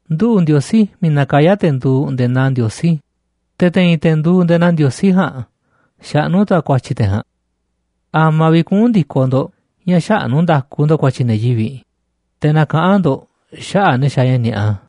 Nduꞌu̱ꞌ Ndiosí miiꞌ nakayá te̱ nduuꞌ nde̱e̱ naa ndiosí, te̱ te̱i̱n te̱ nduuꞌ nde̱e̱ naa ndiosí ja̱a̱nꞌ xaꞌnú tu̱ a̱ ku̱a̱tyi̱ te̱ ja̱a̱nꞌ. ¿A̱ma̱ vi̱ꞌ kuꞌu̱n ndi̱koꞌ ndo̱ꞌ ña̱ xäꞌnú nda̱ku ndo̱ꞌ ku̱a̱tyi̱ ne̱ yivi̱ꞌ, te̱ nakaꞌán ndo̱ꞌ xaꞌa̱ꞌ ne̱ xaaꞌ ña̱ ni̱a̱ꞌa?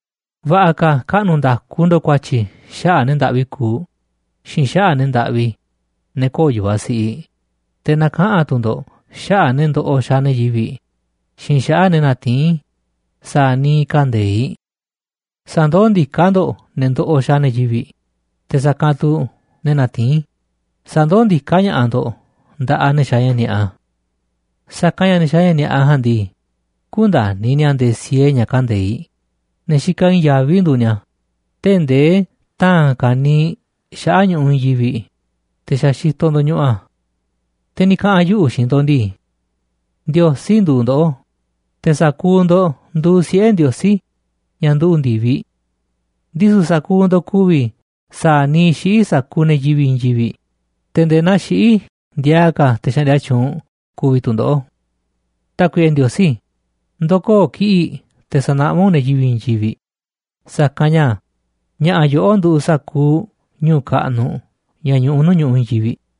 Va̱ꞌa̱ ka̱ kaꞌnu̱ nda̱ku ndo̱ꞌ ku̱a̱tyi̱ xaꞌa̱ꞌ ne̱ ndaꞌvi kuuꞌ xiinꞌ xaꞌa̱ꞌ ne̱ ndaꞌvi, ne̱ köo̱ꞌ yu̱vaꞌ siꞌiꞌ, te̱ na̱kaꞌa̱n tu̱ ndo̱ꞌ xaꞌa̱ꞌ ne̱ ndoꞌoꞌ xaaꞌ ne̱ yivi̱ꞌ xiinꞌ xaꞌa̱ꞌ ne̱ natiín sa̱a̱ niiꞌ kande̱iꞌ. Sa̱ndoó ndiká ndo̱ꞌ ne̱ ndoꞌoꞌ xaaꞌ ne̱ yivi̱ꞌ, te̱ sa̱kanꞌ tu̱ ne̱ natiín, sa̱ndoó ndiká ña̱ꞌaꞌ ndo̱ꞌ nda̱ꞌaꞌ ne̱ xaaꞌ ña̱ ni̱a̱ꞌa. Sa̱kanꞌ ña̱ ne̱ xaaꞌ ña̱ ni̱a̱ꞌa ja̱a̱nꞌ ndii, kündani̱ ni̱a̱ nde̱e̱ siee ña̱ kande̱iꞌ, ne̱ xikaꞌ i̱i̱n yaví nduuꞌ ni̱a̱, tee̱ꞌ nde̱e̱ ta̱a̱n ka̱niiꞌ xaꞌa̱ꞌ ñu̱ꞌuꞌ i̱i̱n yivi̱ꞌ, te̱ xa̱ xitoꞌ ndo̱ñuꞌuꞌ a̱. Te̱ ni̱ kaꞌa̱n yuꞌu̱ xiinꞌ ndo̱ꞌ ndii:nduuꞌ ndoꞌó, te̱ sa̱kuuꞌ ndo̱ꞌ nduuꞌ siꞌe̱ Ndiosí, ña̱ nduꞌu̱ꞌ ndi̱viꞌ. Ndisu̱ sa̱kuuꞌ ndo̱ꞌ ku̱vi̱ sa̱a̱ niiꞌ xiꞌí sa̱kuuꞌ ne̱ yivi̱ꞌ i̱i̱n yivi̱ꞌ, te̱ nde̱e̱ naa xiꞌí ndiaa ka̱ te̱ xaꞌndia tyuunꞌ ku̱vi̱ tu̱ ndoꞌó.” Tákuiꞌe Ndiosí, ndo̱koo̱ kiꞌi̱ꞌ te̱ sa̱naꞌmá u̱nꞌ ne̱ yivi̱ꞌ i̱i̱n yivi̱ꞌ, sa̱kanꞌ ña̱ ña̱ꞌa̱ yoꞌó nduuꞌ sa̱kuuꞌ ñu̱u̱ kaꞌnuꞌ ña̱ ñuꞌuꞌ nuu̱ꞌ ñu̱ꞌuꞌ i̱i̱n yivi̱ꞌ.